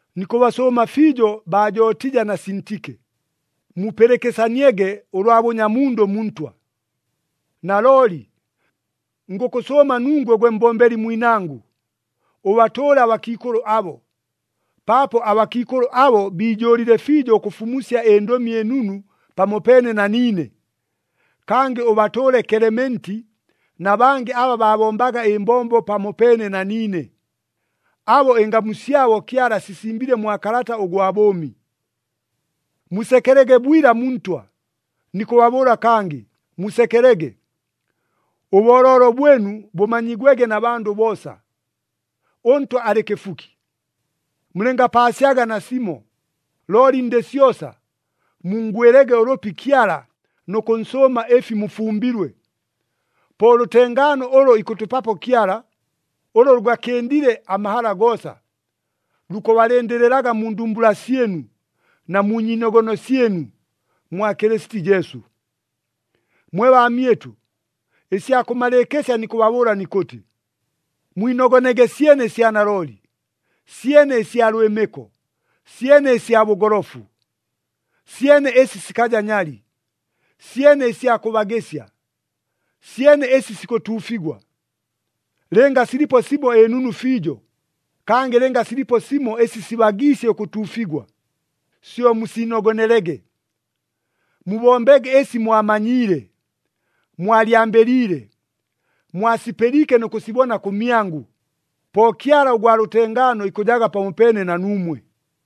Nikʉbasʉʉma fiijo baa Jotija na Sintike, mupɨlɨkɨsaniege ʉlwa bʉnyamundʉ mu Ntwa. Nalooli, ngʉkʉsʉʉma nungwe gwe mbombeli mwinangʉ, ʉbatʉʉle abakiikʉlʉ abo, paapo abakiikʉlʉ abo biijʉʉlile fiijo ʉkʉfumusya ɨNdʉmi ɨNunu pamopeene na niine. Kangɨ ʉbatʉʉle Kelementi na bangɨ aba baabombaga ɨmbombo pamopeene na niine, abo ɨngamu syabo Kyala asisimbile mwa kalata ʉgwa bʉʉmi. Musekelege bwila mu Ntwa. Nikʉbabʉʉla kangɨ, musekelege. Ʉbooloolo bwɨnu bʉmanyigwege na bandʉ boosa. ɄNtwa alɨ kɨfuki. Mulɨngapaasyaga nasimo, looli ndɨ syosa, munngwɨlege ʉlʉpi Kyala nʉ kʉnsʉʉma ɨfi mufumbilwe. Po ʉlʉtengaano ʉlʉ ikʉtʉpapo Kyala, ʉlʉ lʉgakɨndile amahala goosa, lukʉbalɨndɨlɨlaga mu ndumbula syɨnu, na mu nyiinogono syɨnu, mwa Kɨlɨsiti Jesu. Mwe baamyɨtʉ, ɨsya kʉmalɨɨkɨsya nikʉbabʉʉla nikʉtɨ, mwinogonege syene ɨsya nalooli, syene ɨsya lwɨmɨko, syene ɨsya bʉgolofu, syene ɨsi sikaja nyali, syene ɨsya kʉbagɨsya, syene ɨsi sikʉtuufigwa. Lɨnga silipo simo ɨnunu fiijo, kangɨ lɨnga silipo simo ɨsi sibagiisye ʉkʉtuufigwa, syo musiinogonelege. Mubombege ɨsi mwamanyiile, mwalyambɨliile, mwasipɨliike nʉ kʉsibona kʉmyangʉ, po Kyala ʉgwa lʉtengaano ikʉjaga pamopeene na nuumwe.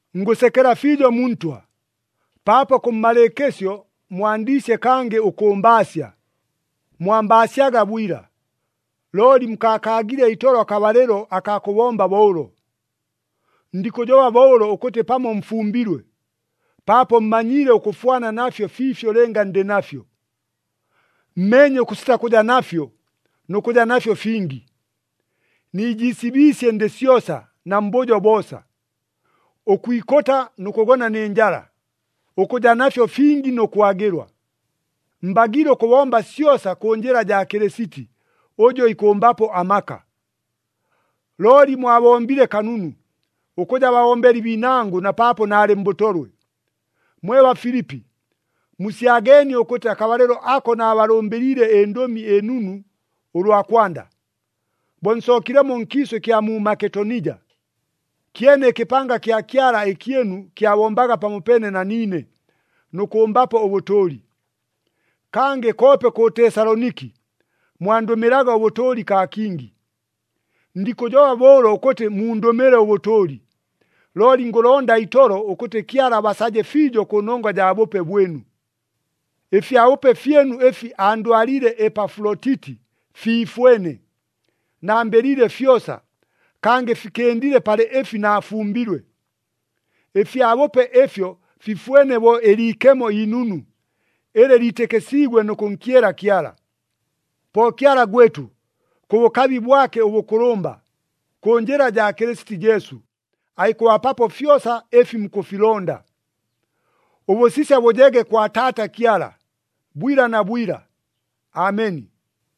Ngʉsekela fiijo mu Ntwa, paapo kʉmmalɨɨkɨsyo mwandiisye kangɨ ʉkʉmbaasya. Mwambaasyaga bwila, looli mukaakaagile itolo akabalɨlo akaa kʉbomba bo ʉlo. Ndikʉjoba bo ʉlo ʉkʉtɨ pamo mfumbilwe, paapo mmanyiile ʉkʉfwana nafyo fiifyo lɨnga ndɨ nafyo. Mmeenye ʉkʉsita kʉja nafyo nʉ kʉja nafyo fingi. Niijiisibiisye ndɨ syosa na mbʉjo boosa, ʉkwikʉta nʉ kʉgona nɨ njala, ʉkʉja nafyo fingi nʉ kwagɨlwa. Mbagiile ʉkʉbomba syosa kʉ njɨla jaa Kɨlɨsiti, ʉjʉ ikʉmbapo amaka. Looli mwabombile kanunu, ʉkʉja babombeli biinangʉ na paapo naalɨ mbʉtolwe. Mwe Bafilipi, musyageenie ʉkʉtɨ akabalɨlo ako naabalʉmbɨliile ɨNdʉmi ɨNunu ʉlwa kwanda, bo nsookilemo nkiisʉ ɨkya mu Maketonija, kyene ɨkɨpanga kya Kyala ɨkyɨnu kyabombaga pamopeene na niine, nʉ kʉmbapo ʉbʉtʉʉli. Kangɨ koope kʉ Tesaloniki, mwandʉmɨlaga ʉbʉtʉʉli kaa kingi. Ndikʉjoba bo ʉlo ʉkʉtɨ mundʉmɨle ʉbʉtʉʉli. Looli ngʉlonda itolo, ʉkʉtɨ Kyala abasaje fiijo kʉnongwa jaa bʉpe bwɨnu. Ɨfyabʉpe fyɨnu ɨfi andwaliile Epafulotiti fiifwene. Nambɨliile fyosa kangɨ fikɨndile palɨ ɨfi naafumbilwe. Ɨfyabʉpe ɨfyo fifwene bo ɨliikemo inunu, ɨlɨ liitɨkɨsiigwe nʉ kʉnkyela Kyala. Po Kyala gwɨtʉ, kʉ bʉkabi bwake ʉbʉkʉlʉmba, kʉ njɨla jaa Kɨlɨsiti Jesu, aikʉbapapo fyosa ɨfi mukʉfilonda. Ʉbʉsisya bʉjege kwa Taata Kyala, bwila na bwila! Ameni.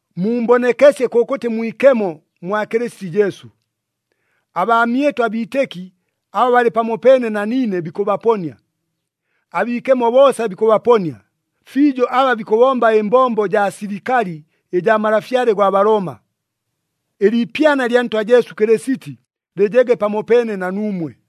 Mumbonekesye kʉkʉtɨ mwikemo mwa Kɨlɨsiti Jesu. Abaamyɨtʉ abiitɨki aba balɨ pamopeene na niine bikʉbaponia. Abiikemo boosa bikʉbaponia, fiijo aba bikʉbomba ɨmbombo jaa silikali ɨjaa malafyale gwa Balooma. Ɨliipyana lya Ntwa Jesu Kɨlɨsiti lɨjege pamopeene na nuumwe.